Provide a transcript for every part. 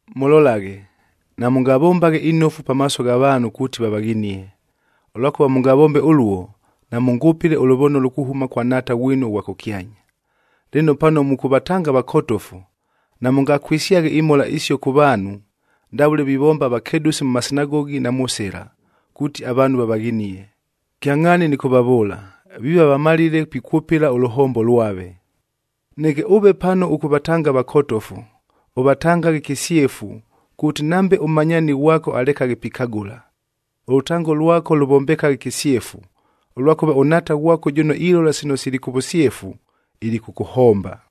“Mʉlolaghe! Namʉngavombaghe inofu pamaaso gha vaanhu kuuti vavaghinie. Ʉlwakʉva mʉngavombe ʉluo, namʉngʉpɨle ʉlʉvonolo kuhʉma kwa Nhaata ghwinu ʉghwa kʉkyanya. Lɨno, pano mʉkʉvatanga avakotofu, namʉngakwɨsyaghe imhola isio kʉ vaanhu ndavʉle vivomba avakedʉsi mʉ masinagogi na mʉ sɨla, kuuti avaanhu vavaghinie. Kyangʼhaani nɨkʉvavʉʉla, viiva vamalile pikwʉpɨla ʉlʉhombo lwave. Neke ʉve pano ʉkʉvatanga avakotofu, ʉvatangaghe kɨsyefu kuuti nambe ʉmmanyaani ghwako alekaghe pikagʉla. Ʉlʉtango lwako lʉvombekaghe kɨsyefu, ʉlwakʉva ʉNhaata ghwako jʉno ilola sino sili kʉ vʉsyefu, ilikʉkʉhomba.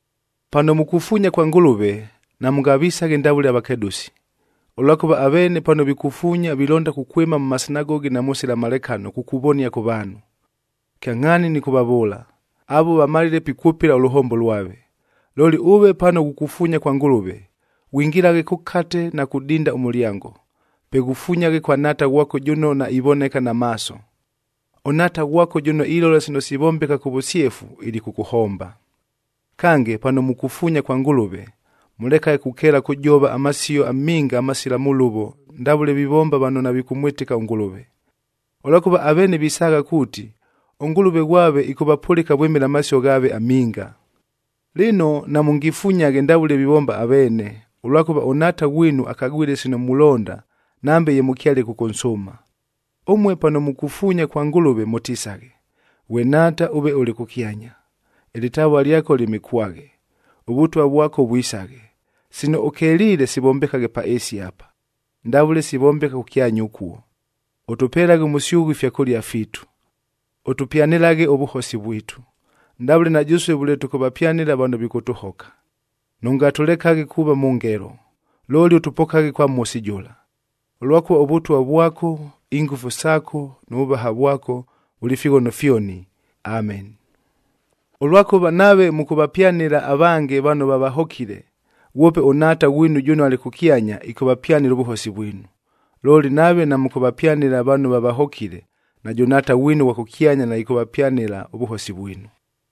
“Pano mukufuunya kwa Ngʉlʉve, namʉngavisaghe ndavʉle avakedʉsi, ʉlwakʉva aveene pano vikufuunya vilonda kukwɨma mʉ masinagogi na mʉ sɨlamalekano kukuvonia kʉ vaanhu. Kyangʼhaani nɨkʉvavʉʉla, avuo vamalile pikwʉpɨla ʉlʉhombo lwave. Looli ʉve pano ghukufuunya kwa Ngʉlʉve, ghwingilaghe kʉkate na kudinda ʉmʉlyango. Pe ghufunyaghe kwa Nhaata ghwako jʉno naivoneka na maaso. ɄNhaata ghwako jʉno ilola sino sivombeka kʉ vʉsyefu, ilikʉkʉhomba. “Kange, pano mukufuunya kwa Ngʉlʉve, mʉlekaghe kukeela kʉjova amasio aminga amasila mʉlʉvo ndavʉle vivomba vano navikʉmwɨtɨka ʉNgʉlʉve. Ʉlwakʉva aveene visaagha kuuti, ʉngʉlʉve ghwave ɨkʉvapʉlɨka vwɨmɨla amasio ghaave aminga. Lɨno, namʉngifunyaghe ndavʉle vivomba aveene, ʉlwakʉva ʉNhaata ghwinu akagwile sino mulonda nambe ye mʉkyale kʉkʉnsʉʉma. Ʉmue pano mukufuunya kwa Ngʉlʉve, mʉtisaghe, ‘Ghwe Nhaata ʉve ʉlɨ kʉkyanya, ɨlɨtavua lyako lyɨmɨkwaghe. ɄVʉtwa vwako vwisaghe. Sino ʉkeliile sivombekaghe pa ɨɨsi apa, ndavʉle sivombeka kʉkyanya ʉkuo. Ʉtʉpelaghe ʉmʉsyʉghʉ ifyakʉlia fiitu. Ʉtʉpyanɨlaghe ʉvʉhosi vwitu, ndavʉle na jʉsue vʉle tʉkʉvapyanɨla vano vikʉtʉhoka. Nʉngatʉlekaghe kuuva mʉ ngelo, looli ʉtʉpokaghe kwa Mhosi jʉla. Ʉlwakʉva ʉVʉtwa vwako, ingʉfu saako nʉ vʉvaha vwako vʉlɨ fighono fyoni! “Ʉlwakʉva nave mʉkʉvapyanɨla avange vano vavahokile, ghwope ʉNhaata ghwinu jʉno alɨ kʉkyanya, ɨkʉvapyanɨla ʉvʉhosi vwinu. Looli, nave namʉkʉvapyanɨla vano vavahokile, najʉ Nhaata ghwinu ʉghwa kʉkyanya naɨkʉvapyanɨla ʉvʉhosi vwinu.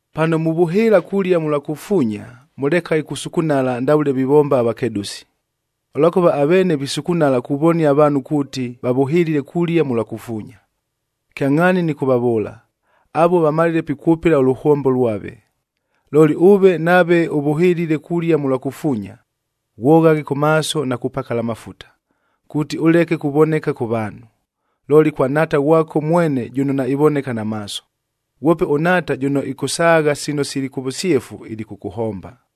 “Pano muvʉhɨɨla kulia mʉlwa kufuunya, mʉlekaghe kusukunala ndavʉle vivomba avakedʉsi, ʉlwakʉva aveene visukunala kuvonia avaanhu kuuti vavʉhɨlile kulia mʉlwa kufuunya. Kyangʼhaani nɨkʉvavʉʉla, avuo vamalile pikwʉpɨla ʉlʉhombo lwave. Looli ʉve nave ʉvʉhɨlile kulia mʉlwa kufuunya, ghwoghaghe kʉ maaso na kupakala amafuta, kuuti ʉleke kuvoneka kʉ vaanhu, looli kwa Nhaata ghwako mwene jʉno naivoneka na maaso. Ghwope ʉNhaata jʉno ɨkʉsaagha sino sili kʉ vʉsyefu, ilikʉkʉhomba.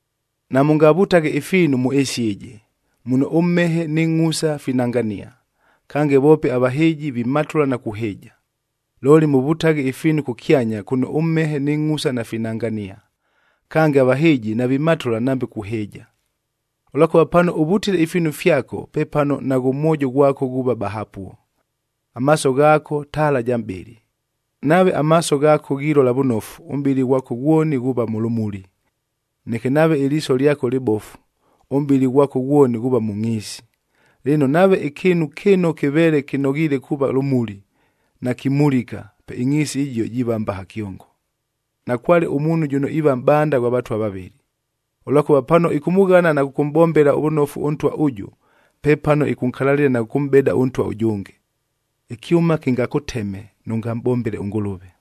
“Namʉngavutaghe ifiinu mʉ ɨɨsi ɨjɨ, muno ʉmhehe nɨ ngʼhusa finangania, kange voope avahɨɨji vimatʉla na kuhɨɨja. Looli mʉvʉtaghe ifiinu kʉkyanya kʉno ʉmhehe nɨ ngʼhusa nafinangania, kange avahɨɨji navimatʉla nambe kuhɨɨja. Ʉlwakʉva pano ʉvutile ifiinu fyako, pepano naghʉ mwojo ghwako ghuuva bahapuo. “Amaaso ghaako taala ja mʼbɨlɨ. Nave amaaso ghaako ghilola vʉnofu, ʉmʼbɨlɨ ghwako ghwoni ghuuva mʉ lʉmuli. Neke nave ɨliiso lyako lɨbofu, ʉmʼbɨlɨ ghwako ghwoni ghuuva mʉ ngʼhiisi. Lɨno, nave ɨkɨɨnu kɨno kɨveele kɨnoghiile kuuva lʉmuli, nakimulika, pe ɨngʼhiisi ɨjio jiiva mbaha kyongo! “Nakwale ʉmuunhu jʉno iiva mʼbanda ghwa vatwa vavɨlɨ. Ʉlwakʉva pano ɨkʉmʉghana na kʉkʉmʼbombela vʉnofu ʉntwa ʉjʉ, pepano ɨkʉnkalalɨla na kʉkʉmʼbeda ʉntwa ʉjʉnge. Ɨkyʉma kɨngakʉteme nʉngamʼbombele ʉNgʉlʉve!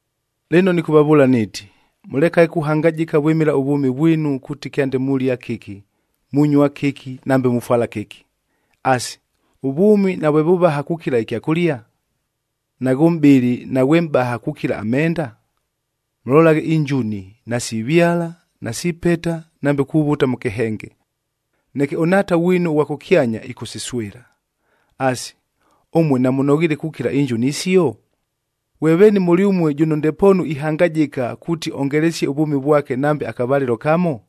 “Lɨno nɨkʉvavʉʉla niiti, mʉlekaghe kuhangajɨka vwɨmɨla ʉvwʉmi vwinu kuuti kyande mulia kɨki, munyua kɨki, nambe mufwala kɨki. Asi, ʉvwʉmi navwe vʉvaha kukila ɨkyakʉlia? Naghʉ mʼbɨlɨ naghwe mʼbaha kukila amenda? Mʉlolaghe injuni! Nasivyala, nasipeta nambe kuvuta mʉ kɨhenge, neke ʉNhaata ghwinu ʉghwa kʉkyanya, ɨkʉsiswɨla. Asi, ʉmue namʉnoghiile kukila injuni isio? Ghwe veeni mʉlyʉmue jʉno ndepoonu ihangajɨka, kuuti ongelesie ʉvwʉmi vwake nambe akavalɨlo kamo?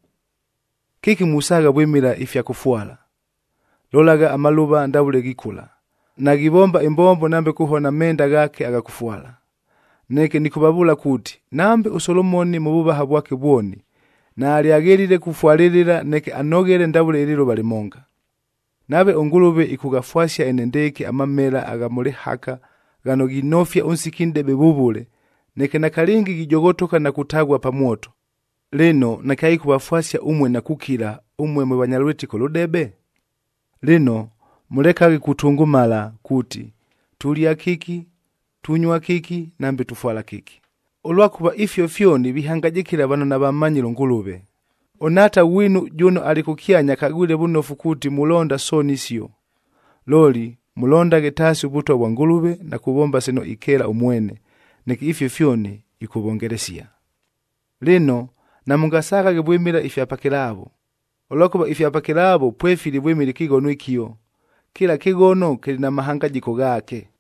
“Kɨki musaagha vwɨmɨla ifya kʉfwala? Lolagha, amalʉva ndavʉle ghikʉla, naghivomba ɨmbombo nambe kuhona amenda ghaake agha kʉfwala. Neke nɨkʉvavʉʉla kuuti, nambe ʉSolomoni mʉ vʉvaha vwake vwoni, naalyaghelile kufwalɨlɨla neke anoghele ndavʉle ɨlɨlʉva lɨmonga! Nave ʉNgʉlʉve ɨkʉghafwasia enendɨɨkɨ amamela agha mʉ lɨhaka ghano ghinofia ʉnsiki nʼdebe vʉvʉle, neke nakalɨngi ghijoghotoka na kutaghua pa mwoto, lɨno nakyaɨkʉvafwasia ʉmue na kukila, ʉmue mwe vanya lwɨtɨko lʉdebe? “Lɨno, mʉlekaghe kutʉngʉmala kuuti, ‘Tulia kɨki, tunyua kɨki, nambe tufwala kɨki,’ ʉlwakʉva ifio fyoni vihangajɨkɨla vano navammanyile ʉNgʉlʉve. ɄNhaata ghwinu jʉno alɨ kʉkyanya akagwile vʉnofu kuuti mulonda sooni isio. Looli mʉlondaghe taasi ʉVʉtwa vwa Ngʉlʉve na kuvomba sino ikeela ʉmwene, neke ifio fyoni ɨkʉvongelesia. “Lɨno, namʉngasaghaghe vwɨmɨla ifya pakɨlaavo, ʉlwakʉva ifya pakɨlaavo pwefili vwɨmɨla ɨkɨghono ɨkio. Kɨla kɨghono kɨlɨ na mahangajɨko ghaake.